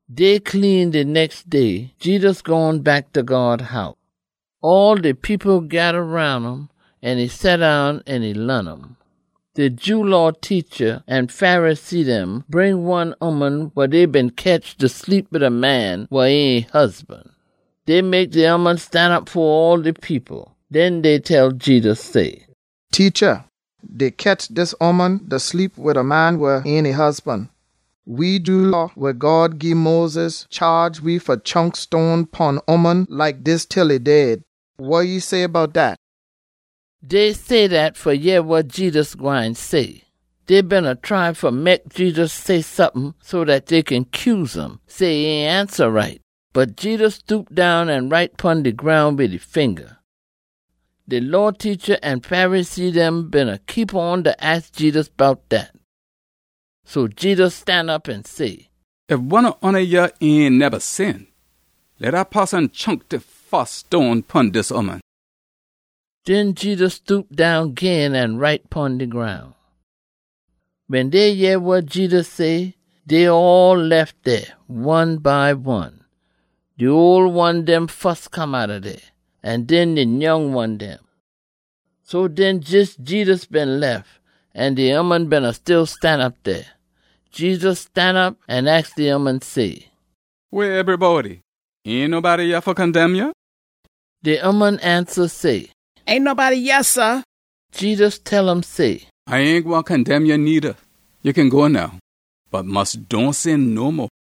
Day clean de nex day, Jedus gone back ta God House. All de people geda roun um an e seddown an e laan um. De Jew Law teacha an Pharisee dem bring one ooman wa dey been ketch da sleep wid a man wa ain e husban. Dey mek de ooman stanop fo all de people. Den dey tell Jedus say, “Teacha, dey ketch dis ooman da sleep wid a man wa ain e husban. We Jew Law wa God gii Moses chaage we fa chunk stone pon ooman like dis til e dead. Wa ya say bout dat?” Dey say dat fa yeh wa Jedus gwine say. Dey beena try fa mek Jedus say sompin so dat dey kin cuse um, say e ain ansa right. Bot Jedus stoop down an write pon de groun wid e finga. De Law teacha an Pharisee dem beena keep on da aks Jedus bout dat, so Jedus stanop an say, “Ef one ob oona yah ain neba sin, leh dat poson chunk de fus stone pon dis ooman.” Den Jedus stoop down gin an write pon de groun. Wen dey yeh wa Jedus say, dey all lef dey, one by one. De ole one dem fus come outta dey, an den de nyoung one dem. So den jes Jedus been lef, an de ooman beena still stanop dey. Jedus stanop an aks de ooman say, “Weh ebrybody? Ain nobody yah fa condemn ya?” De ooman ansa say, “Ain nobody yah, sah!” Jedus tell um say, “A ain gwine condemn ya needa. Ya kin go now, bot mus dohn sin no mo.”]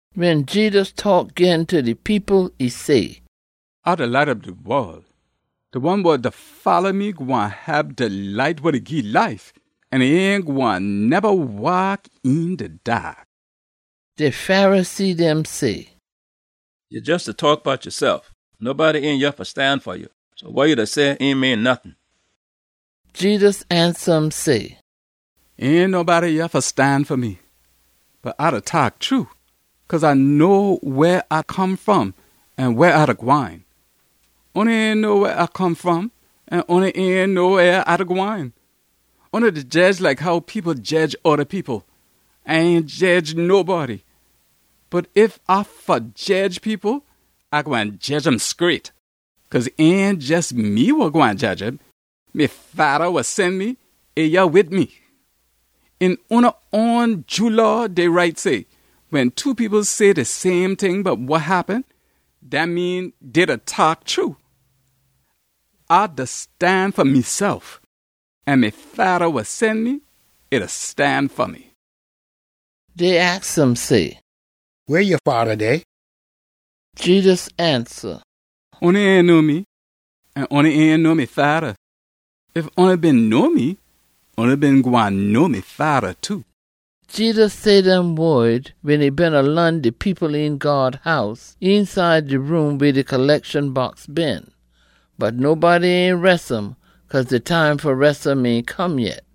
Wen Jedus taak gin ta de people, e say, “A de Light ob de wol. De one wa da folla me gwine hab de light wa da gii life an e ain gwine neba waak een de daak.” De Pharisee dem say, “Ya jes da taak bout yasef. Nobody ain yah fa stan fa ya, so wa ya da say ain mean nottin.” Jedus ansa um say, “Ain nobody yah fa stan fa me. Bot A da taak true, cause A know weh A come fom an weh A da gwine. Oona ain know weh A come fom an oona ain know weh A da gwine. Oona da jedge like how people jedge oda people. A ain jedge nobody. Bot ef A fa jedge people, A gwine jedge um scraight. Cause ain jes me wa gwine jedge um. Me Fada wa sen me, e yah wid me. Een oona own Jew Law dey write say, wen two people say de same ting bout wa happen, dat mean dey da taak true. A da stan fa mesef, an me Fada wa sen me, e da stan fa me.” Dey aks um say, “Weh ya Fada dey?” Jedus ansa, “Oona ain know me, an oona ain know me Fada. Ef oona been know me, oona been gwine know me Fada, too.” Jedus say dem wod wen e beena laan de people een God House, eenside de room weh de collection box been. Bot nobody ain res um cause de time fa res um ain come yet.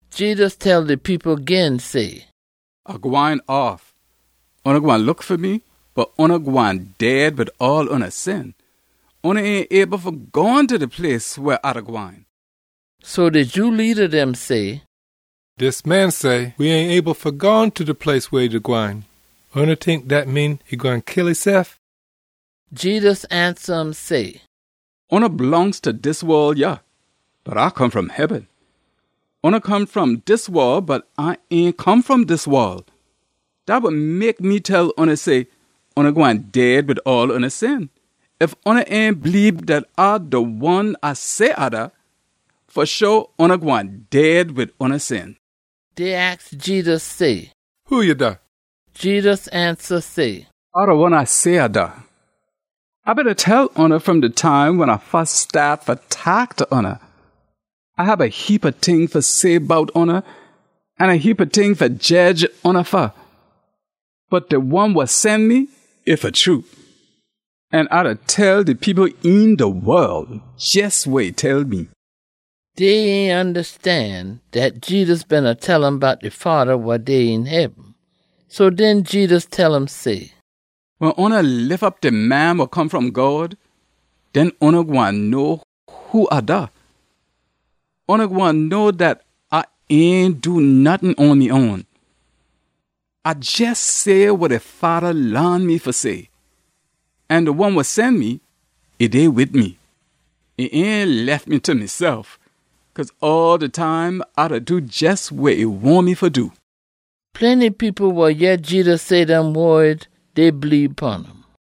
Jedus tell de people gin say, “A gwine off. Oona gwine look fa me, bot oona gwine dead wid all oona sin. Oona ain able fa gone ta de place weh A da gwine.” So de Jew leada dem say, “Dis man say we ain able fa gone ta de place weh e da gwine. Oona tink dat mean e gwine kill esef?” Jedus ansa um say, “Oona blongst ta dis wol yah, bot A come fom heaben. Oona come fom dis wol, bot A ain come fom dis wol. Dat wa mek me tell oona say, oona gwine dead wid all oona sin. Ef oona ain bleebe dat A de one A say A da, fa sho oona gwine dead wid oona sin.” Dey aks Jedus say, “Who ya da?” Jedus ansa say, “A de one A say A da. A beena tell oona fom de time wen A fus staat fa taak ta oona. A hab a heapa ting fa say bout oona, an a heapa ting fa jedge oona fa. Bot de one wa sen me, e fa true. An A da tell de people een de wol jes wa e tell me.” Dey ain ondastan dat Jedus beena tell um bout de Fada wa dey een heaben. So den Jedus tell um say, “Wen oona lif op de Man wa Come fom God, den oona gwine know who A da. Oona gwine know dat A ain do nottin on me own. A jes say wa de Fada laan me fa say. An de one wa sen me, e dey wid me. E ain lef me ta mesef, cause all de time A da do jes wa e wahn me fa do.” Plenty people wa yeh Jedus say dem wod, dey bleebe pon um.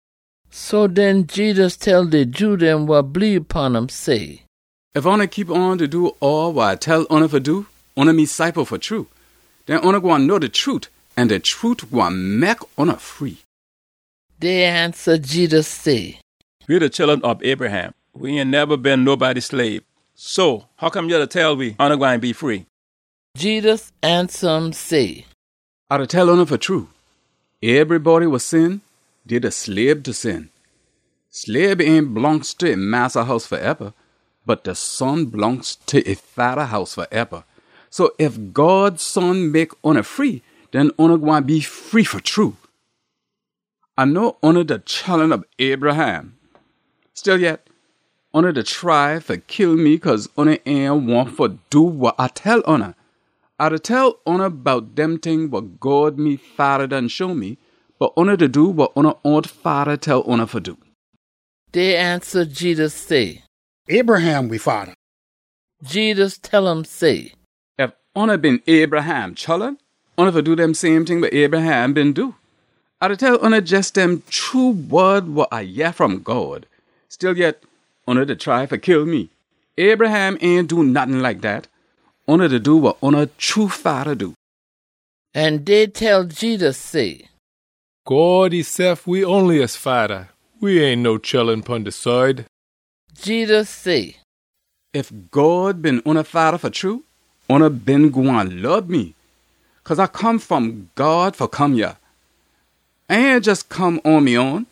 So den Jedus tell de Jew dem wa bleebe pon um say, “Ef oona keep on da do all wa A tell oona fa do, oona me ciple fa true. Den oona gwine know de trute, an de trute gwine mek oona free.” Dey ansa Jedus say, “We de chullun ob Abraham. We ain neba been nobody slabe. So hoccome ya da tell we, ‘Oona gwine be free?’” Jedus ansa um say, “A da tell oona fa true, ebrybody wa sin, dey de slabe ta sin. Slabe ain blongst ta e massa house faeba, bot de son blongst ta e fada house faeba. So ef God Son mek oona free, den oona gwine be free fa true. A know oona de chullun ob Abraham. Stillyet, oona da try fa kill me cause oona ain wahn fa do wa A tell oona. A da tell oona bout dem ting wa God me Fada done show me, bot oona da do wa oona own fada tell oona fa do.” Dey ansa Jedus say, “Abraham we fada.” Jedus tell um say, “Ef oona been Abraham chullun, oona fa do dem same ting wa Abraham been do. A da tell oona jes dem true wod wa A yeh fom God. Stillyet, oona da try fa kill me. Abraham ain do nottin like dat. Oona da do wa oona true fada do.” An dey tell Jedus say, “God esef we onliest Fada. We ain no chullun pon de side.” Jedus say, “Ef God been oona Fada fa true, oona been gwine lob me. Cause A come fom God fa come yah. A ain jes come on me own,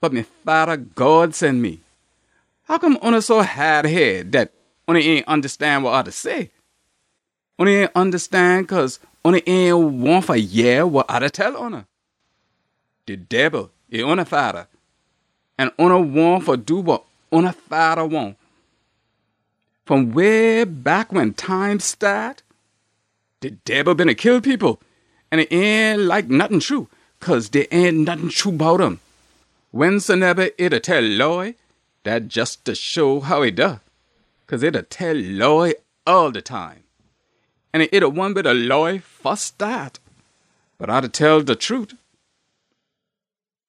bot me Fada God sen me. Hoccome oona so haad head dat oona ain ondastan wa A da say? Oona ain ondastan cause oona ain wahn fa yeh wa A da tell oona. De Debil, e oona fada, an oona wahn fa do wa oona fada wahn. Fom way back wen time staat, de Debil beena kill people. An e ain like nottin true, cause dey ain nottin true bout um. Wensoneba e da tell lie, dat jes da show how e da, cause e da tell lie all de time. An e de one weh de lie fus staat. Bot A da tell de trute.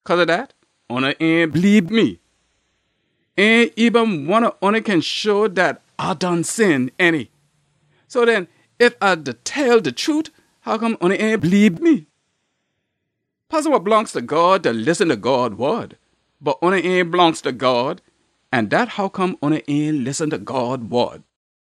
Cause ob dat, oona ain bleebe me! Ain eben one ob oona kin show dat A done sin, ainty? So den, ef A da tell de trute, hoccome oona ain bleebe me? Poson wa blongst ta God da listen ta God wod. Bot oona ain blongst ta God, an dat hoccome oona ain listen ta God wod.”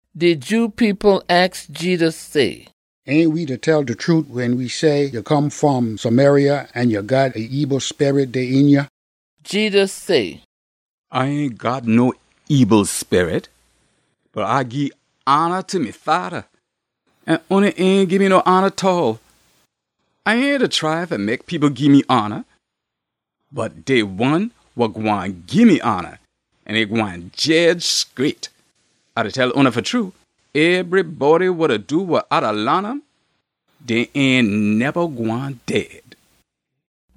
De Jew people aks Jedus say, “Ain we da tell de trute wen we say ya come fom Samaria an ya got a ebil sperit dey een ya?” Jedus say, “A ain got no ebil sperit, bot A gii hona ta me Fada. An oona ain gii me no hona tall. A ain da try fa mek people gii me hona. Bot dey one wa gwine gii me hona, an e gwine jedge scraight. A da tell oona fa true, ebrybody wa da do wa A da laan um, dey ain neba gwine dead.”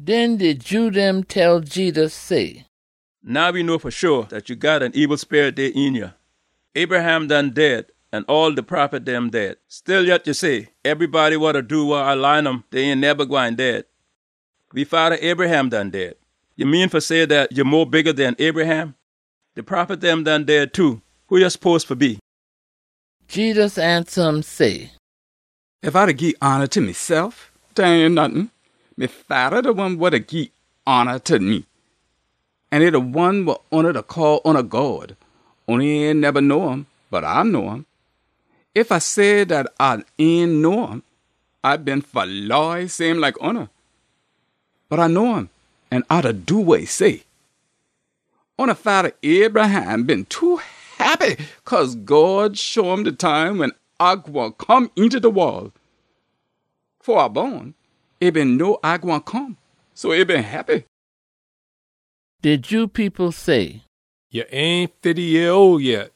Den de Jew dem tell Jedus say, “Now we know fa sho dat ya got a ebil sperit dey een ya! Abraham done dead, an all de prophet dem dead. Stillyet ya say, ‘Ebrybody wa da do wa A da laan um, dey ain neba gwine dead.’ We fada Abraham done dead. Ya mean fa say dat ya mo bigga den Abraham? De prophet dem done dead too. Who ya spose fa be?” Jedus ansa um say, “Ef A da gii hona ta mesef, dat ain nottin. Me Fada de one wa da gii hona ta me, an e de one wa oona da call oona God. Oona ain neba know um, bot A know um. Ef A say dat A ain know um, A been fa lie same like oona. Bot A know um, an A da do wa e say. Oona fada Abraham been too heppy cause God show um de time wen A gwine come eenta de wol. Fo A bon, e been know A gwine come, so e been heppy.” De Jew people say, “Ya ain fifty yeah ole yet.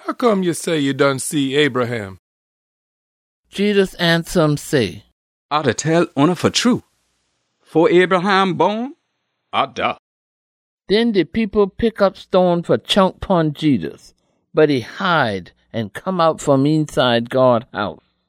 Hoccome ya say ya done see Abraham?” Jedus ansa um say, “A da tell oona fa true, fo Abraham bon, ‘A da.’” Den de people pick op stone fa chunk pon Jedus, bot e hide an come out fom eenside God House.